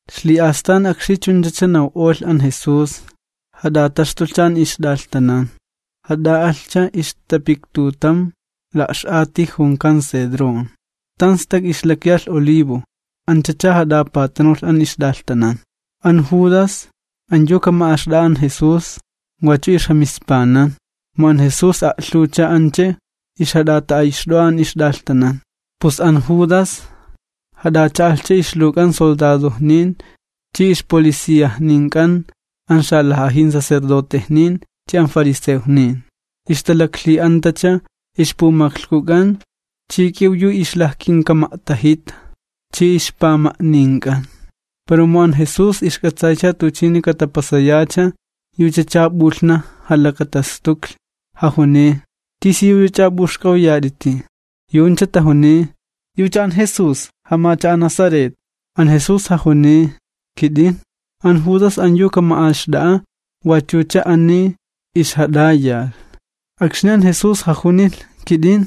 Ixli'astan akxni chunchacha naw'olh an Jesús, jat'ataxtulhcha an ixt'alhtanan, jat'a'alhcha ixlitapiktutam la'x'ati junkan Cedrón, tan stak ixlakyalh olivo, anchacha jat'apatanulh an ixt'alhtanan. An Judas, an yu kama'axt'a'a an Jesús, wachu ixjamispanan, mu an Jesús a'lhuwcha ancha ixjat'ata'ayxt'o'a an ixt'alhtanan. Pus an Judas jat'acha'alhcha ixluwk'an soldadojnin chi ixpoliciajnink'an an xalaj'ajin sacerdotejnin chi an fariseojnin, ixtalaklhi'antacha ixpumaklhkuk'an chi k'iw yu ixlajkinkama'tajita chi ixpama'nink'an. Pero mu an Jesús ixk'atsaycha tuchini katapasayacha, yuchacha p'ulhnaj jalakatastuklhi, jajuniy: ―¿Tisiyuch'ach'a p'uxk'awyat'iti? Yu'uncha tajuniy: ―Yucha an Jesús jamacha'a' Nazaret. An Jesús jajuniy: ―Kit'in. An Judas an yu kama'axt'a'a wachucha ani ixjat'ayalh. Akxni an Jesús jajunilh: “Kit'in”,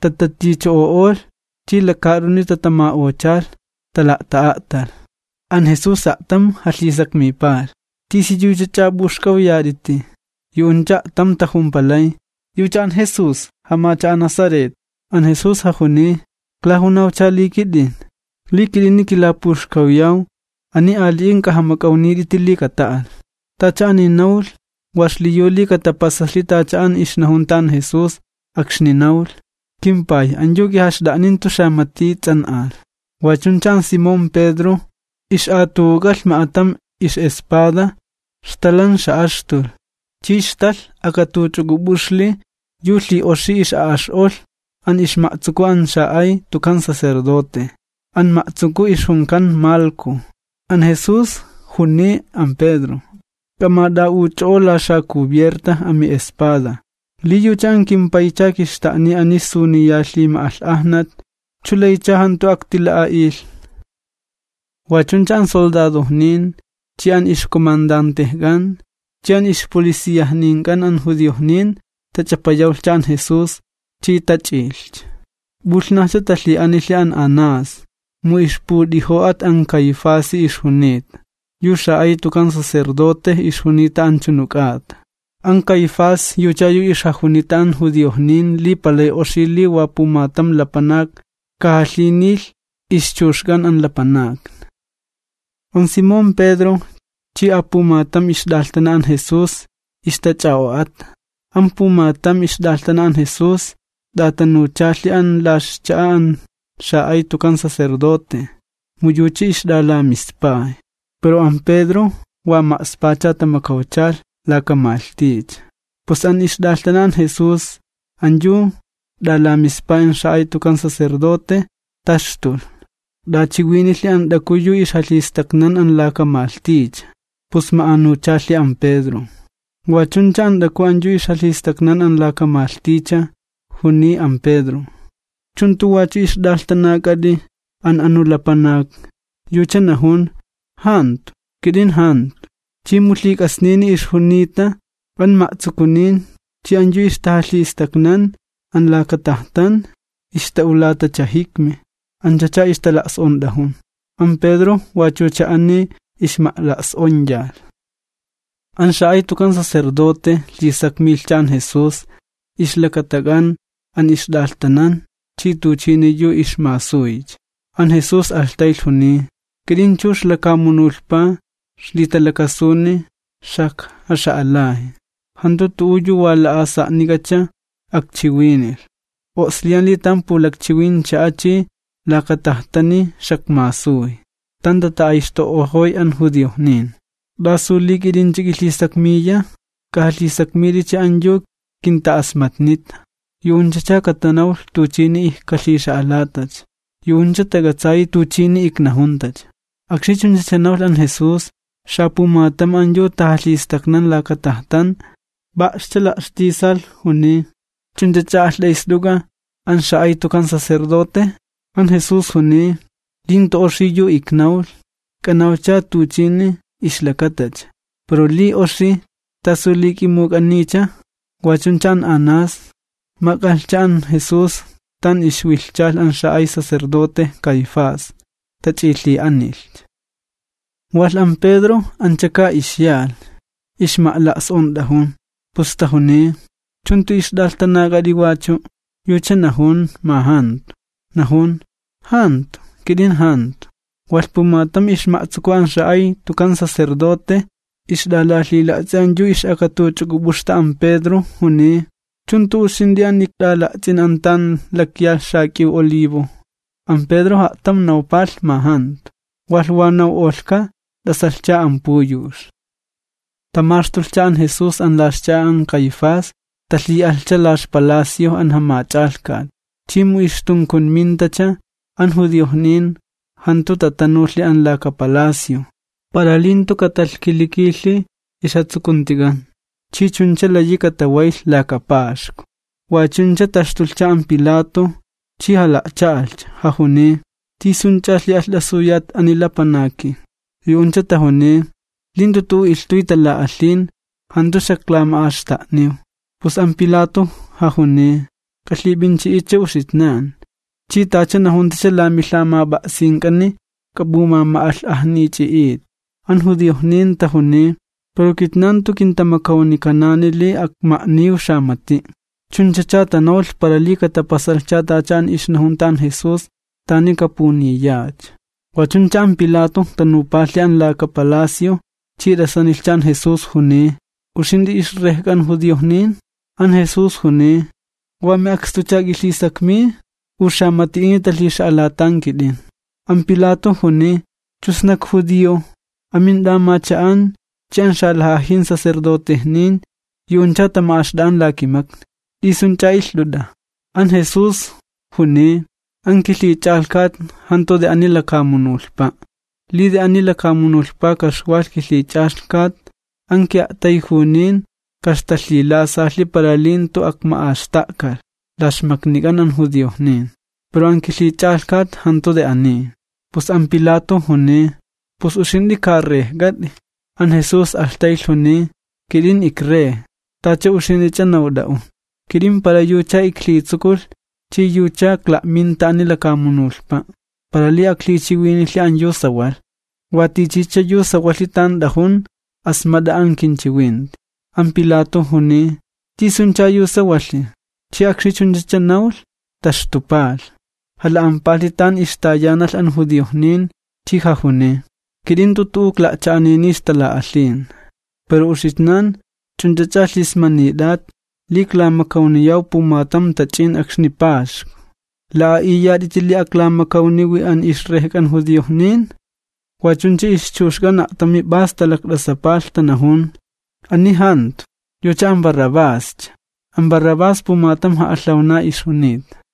tataticho'olh chi lakaat'uni tatama'ochalh, tala'ta'a'talh. An Jesús a'tam jalhisakmipalh: ―¿Tisiyuch'ach'a p'uxk'awyat'iti? Yu'uncha a'tam tajumpalay: ―Yucha an Jesús jamacha'a' Nazaret. An Jesús jajuniy: ―Iklajunawcha li kit'in. Li kit'ini kilapuxkawyaw, ani ali'in k'ajamak'awnit'iti li kata'alh. Tacha ani nawlh wa xliyu li katapasalhi tacha an ixnajunta an Jesús, akxni nawlh: “KimPay, an yu k'ijaxt'a'nin jantu xamati ts'an'alh.” Wa chuncha an Simón Pedro, ix'atu'uk'alh ma'atam ix'espada, xtalan xa'axtulh, chi xtalh akatuch'uk'up'uxli yu lhi'oxi ix'a'ax'olh an ixma'tsuku an xa'ay tukan sacerdote, an ma'tsuku ixjunkan Malco. An Jesús juniy an Pedro: ―¡K'amat'a'uch'o'o la xacubierta ami'espada! Li yucha an kimPaycha kixta'niy ani suniya lhima'alh'ajna, ¿chu laycha jantucha aktila'a'ilh? Wa chuncha an soldadojnin, chi an ixcomandantejk'an, chi an ixpoliciajnink'an an judiojnin, tach'apayawlhcha an Jesús chi tach'iylhcha. P'ulhnajcha talhi'anilh an Anás, mu ixput'ijo'at an Caifasi ixjunita, yu xa'ay tukan sacerdote ixjunita anchunu k'ata. An Caifás yucha yu ixjajunita an judiojnin li palay oxi li wa pumatam lapanak kajalhinilh ixchuxk'an an lapanakni. An Simón Pedro chi apumatam ixt'alhtana an Jesús ixtach'a'o'ata. An pumatam ixt'alhtana an Jesús t'atanuchalhi an la ixcha'a an xa'ay tukan sacerdote, mu yucha ixt'alamispay. Pero an Pedro wa ma'spacha tamakawchalh, laka malhticha. Pus an ixt'alhtana an Jesús an yu t'alamispay an xa'ay tukan sacerdote, taxtulh, t'achiwinilhi an t'aku yu ixjalhistaknan an laka malhticha, pus ma'anuchalhi an Pedro. Wa chuncha an t'aku an yu ixjalhistaknan an laka malhticha, juniy an Pedro: ―¿Chu jantu wachu ixt'alhtanak'at'i an anu lapanak? Yucha najun: ―Jantu, kit'in jantu. Chi mu lhik'asnini ixjunita, an ma'tsukunin chi an yu ixtajalhistaknan an laka tajtan, ixta'ulatacha jikmi, anchacha ixtala's'ont'ajun. An Pedro wachucha ani ixma'la's'onyalh. An xa'ay tukan sacerdote lhisakmilhcha an Jesús ixlakatak'an an ixt'alhtanan chi tuchini yu ixmasuycha. An Jesús alhtaylh juniy: ―Kit'in chux lakamunulhpa ixlitalakasuni xajkaxa'alay. Jantu tu'u yu wa la'asa'nik'acha akchiwinilh, o'sliyan li tan pulakchiwin ch'a'a chi laka laktajtani xakmasuy, tan tata'ayxto'ojoy an judiojnin. ¿T'asu li k'it'inch'a k'ilhisakmiya? K'ajalhisakmit'icha an yu kinta'asmatnita, yu'unchacha katanawlh tuchini ijkalhixa'alatacha. Yu'uncha tak'atsayi tuchini iknajuntacha. Akxni chunchacha nawlh an Jesús, xapumatam an yu tajalhistaknan an laka tajtan lo'scha la'xtisalh, juniy: ―¿Ch'unch'ach'a alht'ayst'uk'a an xa'ay tukan sacerdote? An Jesús juniy: ―Li jantu oxi yu iknawlh, k'anawcha tuchini chunchacha, pero li oxi, ¿t'asu li k'imuk'aniycha? Wa chuncha an Anás, mak'alhcha an Jesús tan ixwilhchalh an xa'ay sacerdote Caifás, tach'ilhi'anilhcha. Walh an Pedro, anchaka ixyalh ixma'la's'ont'ajun, pus tajuniy: ―¿Chu jantu ixt'alhtanak'at'i wachu'? Yucha najun ma jantu, najun: ―¡Jantu, kit'in jantu! Walh pumatam ixma'tsuku an xa'ay tukan sacerdote, ixt'alalhila'ts'i an yu ix'akatuch'uk'up'uxta an Pedro, juniy: ―¿Chu jantu uxint'i an ikt'ala'ts'in an tan lakyalh xak'iw olivo? An Pedro a'tam nawpalh ma jantu, walh wa naw'olhka, t'asalhcha an puyux. Tamaxtulhcha an Jesús an la ixcha'a an Caifás, talhi'alhcha la ixpalacio an jamach'alhkat. Chi mu ixtunkunmintacha, an judiojnin jantu tatanulhi an laka palacio, para li jantu katalhkilikilhi ixjatsukuntik'an chi chuncha layi katawaylh laka Paxku. Wa chuncha taxtulhcha an Pilato, chi jala'cha'alhcha, jajuniy: ―¿T'isunch'a lhi'alht'asuyat ani lapanaki? Yu'uncha tajuniy: ―Li jantu tu'u ilhtuy tala'alhin, jantu xaklama'axta'niw. Pus an Pilato jajuniy: ―K'alhip'inchi'itcha uxitnan, chi tacha najuntacha la milhamap'a'sink'ani k'ap'umama'alh'ajnichi'it. An judiojnin tajuniy: ―Pero kitnan jantu kintamakawnikanani li akma'niw xamati'. Chunchacha tanawlh para li katapasalhcha tacha an ixnajunta an Jesús, tani kapuniyacha. Wa chuncha an Pilato tanupalhi an laka palacio, chi t'asanilhcha an Jesús, juniy: ―¿Uxint'i ixrejk'an judiojnin? An Jesús juniy: ―¿Wa mi'akst'uch'a k'ilhisakmiy u xamati'ini talhixa'alatan kit'in? An Pilato juniy: ―¿Chu sna ikjudio? Amint'amacha'an chi an xalaj'ajin sacerdotejnin yu'uncha tama'axt'a'an la kimakni. ¿T'isunch'a ilht'ut'a? An Jesús juniy: ―An kilhich'alhkat jantu xanawin ani lakamunulhpa'. Li xanawin ani lakamunulhpa ka'ixwalh kilhich'alhkat, an ki'a'tayjunin ka'ixtalhilasalhi para li jantu akma'axta'kalh la ixmaknik'an an judiojnin. Pero an kilhich'alhkat jantu aniya xanawin. Pus an Pilato juniy: ―¿Pus, uxint'i ka Rejk'at'i? An Jesús alhtaylh, juniy: ―Kit'in ikRey, tacha uxint'ich'a nawt'a'un. Kit'in ixlakata yucha li iktsukulh chi yucha ikla'minta ani lakamunulhpa', para li aklhichiwinilhi an yu sawalh. Wa tichicha yu sawalhi tan t'ajun, asmat'a an kinchiwinti. An Pilato juniy: ―¿Tisuncha yu sawalhi? Chi akxni chunchacha nawlh, taxtupalh, jala'ampalhi tan ixtayanalh an judiojnin, chi jajuniy: ―Kit'in jantu tu'u ikla'cha'anini ixtala'alhin. Pero uxitnan ch'unch'a lhismanit'at li iklamakawniyaw pumatam tach'in akxni Paxku. ¿La'a'iyat'iti li aklamakawniwi an ixRejk'an judiojnin? Wa chuncha ixchuxk'an a'tam p'as talakt'asapalh, tanajun: ―¡Ani jantu! ¡Yucha an Barrabás! An Barrabás, pumatam ja'alhawna ixjunita.